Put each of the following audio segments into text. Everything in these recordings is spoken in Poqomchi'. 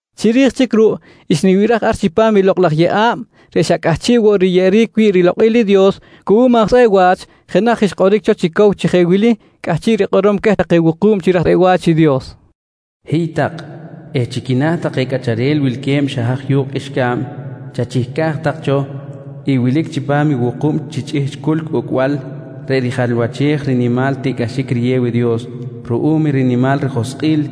Chiri̱j chic ruꞌ xnibiraj ar chipam i lokꞌ laj yeꞌa̱b reꞌ xa cꞌahchiꞌ woꞌ riyeꞌeric wi̱ꞌ rilokꞌil i Dios cuꞌum aj tzꞌeꞌ wa̱ch, jenaj xkꞌoric cho chi cow chi jeꞌ wili cꞌahchiꞌ rikꞌorom queh take wuku̱b chi raj tzꞌeꞌ wa̱ch i Dios: «Hiy tak eh chi quina̱ take cꞌacharel wilque̱b xa haj yu̱kꞌ qꞌuixca̱b chachihcaj tak cho i wilic chipam i wuku̱b chi chꞌihchꞌ culc ucꞌbal reꞌ rijalwachej rinimal tiꞌcꞌaxic riyew i Dios ruꞌum i rinimal rijoskꞌil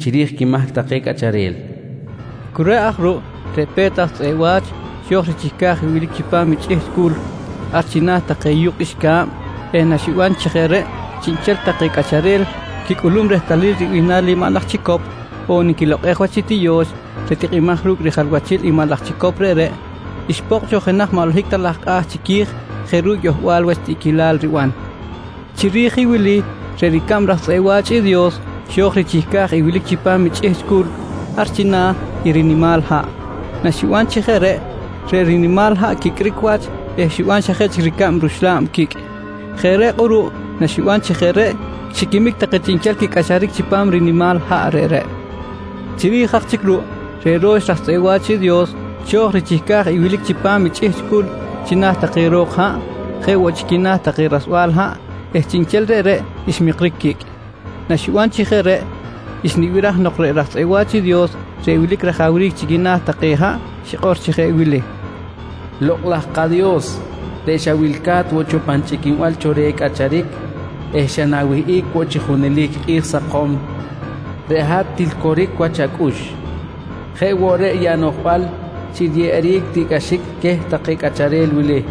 chiri̱j quimahc take cꞌacharel, nqui queh. Cu reꞌ aj ruꞌ reꞌ pe̱t aj tzꞌeꞌ wa̱ch xo̱j richihca̱j i wilic chipam i chꞌihchꞌ culc, ar china̱ take yu̱kꞌ qꞌuixca̱b eh naxiban chi jeꞌ reꞌ chiꞌnchel take cꞌacharel quicꞌulum rehtalil ribihnal i maꞌ laj chicop on nquilokꞌej wach i tiyo̱x reꞌ tikꞌimaj ru̱cꞌ rijalwachil i maꞌ laj chicop reꞌreꞌ, xpokꞌ cho jenaj maꞌ holohic ta laj kꞌa̱ chiqui̱j jeꞌ ru̱cꞌ yohbal wach tiꞌquilal riban. Chiri̱j i wili reꞌ ricab raj tzꞌeꞌ wa̱ch i Dios xo̱j woꞌ richihca̱j i wilic chipam i chꞌihchꞌ culc, ar china̱ i rinimal haꞌ. Naxiban chi jeꞌ reꞌ, reꞌ rinimal haꞌ quicꞌric wach eh xiban xa jeꞌ chic ricab ruxla̱b quicꞌ. Jeꞌ reꞌ kꞌuruꞌ naxiban chi jeꞌ reꞌ xiquimic take chiꞌnchel quicꞌacharic chipam rinimal haꞌ reꞌreꞌ. Chiri̱j aj ruꞌ, reꞌ ro̱x raj tzꞌeꞌ wa̱ch i Dios xo̱j richihca̱j i wilic chipam i chꞌihchꞌ culc china̱ take ro̱k haꞌ, jeꞌ woꞌ chi quina̱ take rasbal haꞌ eh chiꞌnchel reꞌreꞌ ximikric quicꞌ. Naxiban chi jeꞌ reꞌ xnibiraj nok reꞌ raj tzꞌeꞌ wa̱ch i Dios reꞌ wilic rajawric chi quina̱ take haꞌ xikꞌor chi jeꞌ wili: «Lokꞌ laj kaDios reꞌ xawilca̱t woꞌ cho pan chꞌiquinbal cho reh i cꞌacharic eh xa na̱wihꞌic woꞌ chi junelic kꞌi̱j sakom, reꞌ hat til coric wach acꞌux. Jeꞌ woꞌ reꞌ i anoꞌjbal chi riyeꞌeric take tiꞌcꞌaxic queh take cꞌacharel wili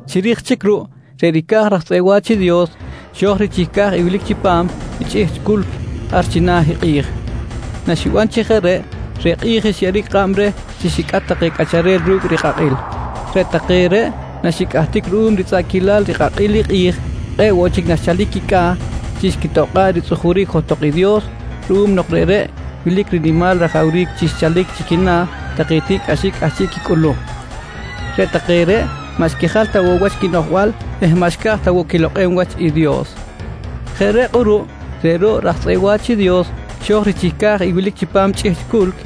Chiri̱j chic ruꞌ, reꞌ ricaj raj tzꞌeꞌ wa̱ch i Dios xo̱j richihca̱j i wilic chipam i chꞌihchꞌ culc ar china̱ i kꞌi̱j. Naxiban chi jeꞌ reꞌ, reꞌ kꞌi̱j xyeꞌeric kꞌab reh chi xicꞌat take cꞌacharel ru̱cꞌ i rikꞌakꞌil. Reꞌ take reꞌ naxicꞌahtic ruꞌum ritzꞌaꞌquilal rikꞌakꞌil i kꞌi̱j kꞌe̱ꞌ woꞌ chic naxchalic quicꞌa̱ chi xquitokꞌa̱ꞌ ritzꞌujuric johtok i Dios ruꞌum nok reꞌreꞌ wilic rinimal rajawric chi xchalic chi quina̱ take tiꞌcꞌaxic cꞌahchiꞌ quicꞌulum. Reꞌ take reꞌ maꞌ xquijal ta woꞌ wach quinoꞌjbal eh maꞌ xca̱j ta woꞌ quilokꞌem wach i Dios. Jeꞌ reꞌ kꞌuruꞌ reꞌ ro̱ꞌ raj tzꞌeꞌ wa̱ch i Dios xo̱j richihca̱j i wilic chipam chꞌihchꞌ culc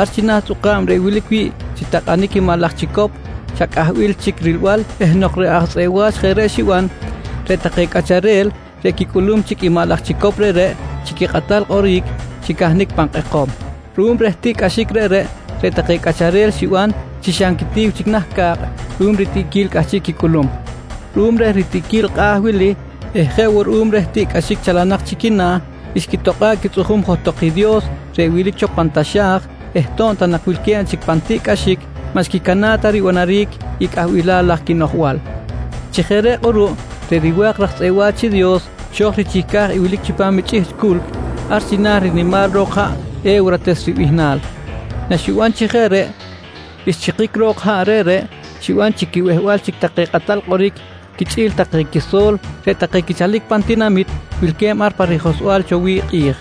ar china̱ i tzꞌuka̱b reꞌ wilic wi̱ꞌ chi takꞌanic i maꞌ laj chicop xa cꞌahbil chic rilbal eh nok reꞌ aj tzꞌeꞌ wa̱ch jeꞌ reꞌ xiban, reꞌ take cꞌacharel reꞌ quicꞌulum chic i maꞌ laj chicop reꞌreꞌ chi quikꞌatal kꞌoric xicahnic pan kꞌekom. Ruꞌum reh tiꞌcꞌaxic reꞌreꞌ, reꞌ take cꞌacharel xiban chi xa nquitiw chic nah ca̱kꞌ ruꞌum ritiꞌquil cꞌahchiꞌ quicꞌulum. Ruꞌum reh ritiꞌquil kꞌa̱ wili eh jeꞌ woꞌ ruꞌum reh tiꞌcꞌaxic chalanak chi quina̱ xquitokꞌa̱ꞌ quitzꞌujum johtok i Dios reꞌ wilic cho pan taxa̱j eh to̱b ta nak wilque̱b chic pan tiꞌcꞌaxic maꞌ xquicana̱ꞌ ta ribanaric i cꞌahbilal laj quibano̱j. Chi jeꞌ reꞌ kꞌuruꞌ reꞌ riwa̱k raj tzꞌeꞌ wa̱ch i Dios xo̱j richihca̱j i wilic chipam i chꞌihchꞌ culc ar china̱ rinimal ro̱k haꞌ “E̱wrates” ribihnal. Naxiban chi jeꞌ reꞌ, xchikic jok i haꞌ reꞌreꞌ, xiban chi quibehbal chic take kꞌatal kꞌoric quichꞌi̱l take quiso̱l reꞌ take quichalic pan tak tinamit wilque̱b ar pa rijohsbal cho wi̱ꞌ i kꞌi̱j.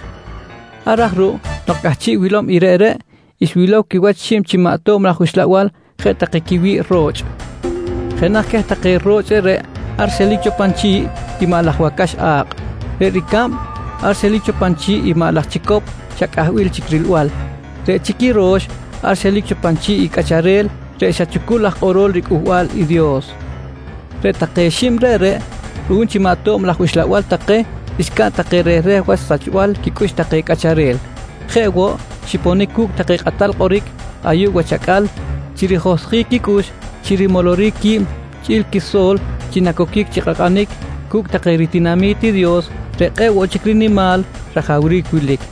Ar aj ruꞌ nok cꞌahchiꞌ wilom i reꞌreꞌ, xwilow quiwach xib chi maꞌ tob laj uxlabal jeꞌ take quiwi̱ꞌ ro̱chꞌ. Jenaj queh take ro̱chꞌ reꞌreꞌ ar xelic cho pan chi̱ꞌ i maꞌ laj wacax a̱kꞌ. Reꞌ ricab ar xelic cho pan chi̱ꞌ i maꞌ laj chicop xa cꞌahbil chic rilbal. Reꞌ chic i ro̱x ar xelic cho pan chi̱ꞌ i cꞌacharel reꞌ xa chucul aj kꞌorol riCꞌuhbal i Dios. Reꞌ take xib reꞌreꞌ, ruꞌum chi maꞌ tob laj uxlabal take, xcaꞌn take rehreh wach sachbal quicꞌux take cꞌacharel. Jeꞌ woꞌ, xiponic woꞌ cu̱cꞌ take kꞌatal kꞌoric ayuꞌ wach acꞌal chi rijohsjic quicꞌux chi rimoloric qui̱b chꞌi̱l quiso̱l chi nacoquic chi kꞌakꞌanic cu̱cꞌ take ritinami̱t i Dios reꞌ kꞌe̱ꞌ woꞌ chic rinimal wach rajawric wilic.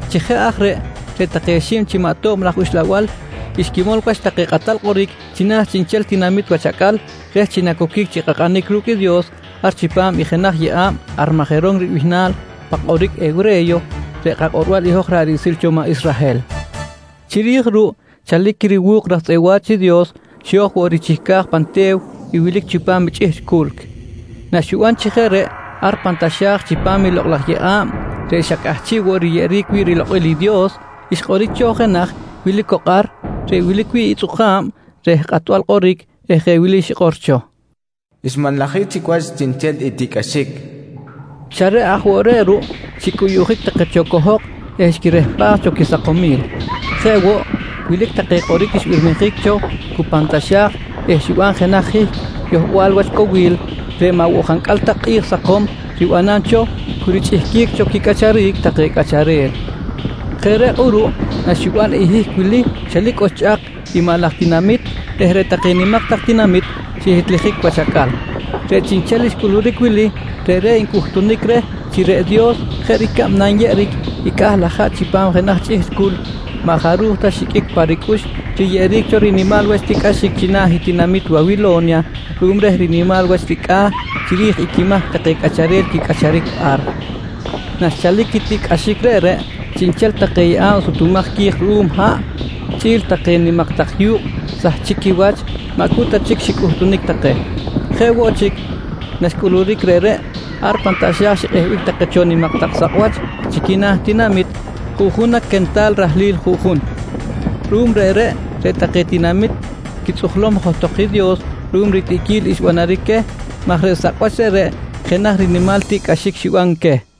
Chi jeꞌ aj reꞌ, reꞌ take xib chi maꞌ tob laj uxlabal xquimol wach take kꞌatal kꞌoric chiꞌnchel tinamit wach acꞌal reh chi nacoquic chi kꞌakꞌanic ru̱cꞌ i Dios ar chipam i jenaj yeꞌa̱b “Armajeron” ribihnal pan kꞌoric hewre̱yo reꞌ kakꞌorbal i hoj ra̱ꞌ riꞌsil cho maꞌ Israhel. Chiri̱j ruꞌ chalic i riwu̱k raj tzꞌeꞌ wa̱ch i Dios xo̱j woꞌ richihca̱j pan te̱w i wilic chipam i chꞌihchꞌ culc. Naxiban chi jeꞌ reꞌ ar pan taxa̱j chipam i lokꞌ laj yeꞌa̱b reꞌ xa cꞌahchiꞌ woꞌ riyeꞌeric wi̱ꞌ rilokꞌil i Dios, xkꞌoric cho jenaj wilic cok ar reꞌ wilic wi̱ꞌ i tzꞌuka̱b reh kꞌatbal kꞌoric eh jeꞌ wili xikꞌor cho: «Xmanlajic chic wach chiꞌnchel i tiꞌcꞌaxic, nqui xikꞌor cho. Xa reꞌ aj woꞌ reꞌ ruꞌ, xicꞌuyuꞌjic take cho cohok eh xquirehpaj cho quisakomil. Jeꞌ woꞌ, wilic take kꞌoric xbirmijic cho cu pan taxa̱j eh xiban jenaj hihc yohbal wach cowil reꞌ maꞌ woꞌ jancꞌal ta kꞌi̱j sakom ribanam cho cu richꞌihquic cho quicꞌacharic take cꞌacharel. Jeꞌ reꞌ kꞌuruꞌ naxiban i hihc wili, xelic oxchꞌak i maꞌ laj tinamit eh reꞌ take nimak tak tinamit xihitlijic wach acꞌal. Reꞌ chiꞌnchel xcꞌuluric wili reꞌreꞌ ncꞌuhtunic reh chi reꞌ Dios jeꞌ ricab nanyeꞌeric i cꞌah laj haꞌ chipam jenaj chꞌihchꞌ culc, maꞌ jaruj ta xiqꞌuic pa ricꞌux riyeꞌeric cho rinimal wach tiꞌcꞌaxic china̱ i tinamit Wawilo̱nya ruꞌum reh rinimal wach ricꞌa̱ chiri̱j i quimahc take cꞌacharel quicꞌacharic ar. Naxchalic i tiꞌcꞌaxic reꞌreꞌ, chiꞌnchel take yeꞌa̱b sutumaj qui̱j ruꞌum haꞌ, chꞌi̱l take nimak tak yu̱kꞌ sahchic quiwach, maꞌ cu ta chic xicꞌutunic take. Jeꞌ woꞌ chic naxcꞌuluric reꞌreꞌ, ar pan taxa̱j xikꞌehbic take cho nimak tak sakꞌwach chi quina̱ tinamit, juꞌjun na quental rahlil juꞌjun. Ruꞌum reꞌreꞌ, reꞌ take tinamit xquitzꞌujlom johtok i Dios ruꞌum ritiꞌquil xbanaric queh maj reꞌ sakꞌwach reꞌreꞌ jenaj rinimal tiꞌcꞌaxic xiban queh.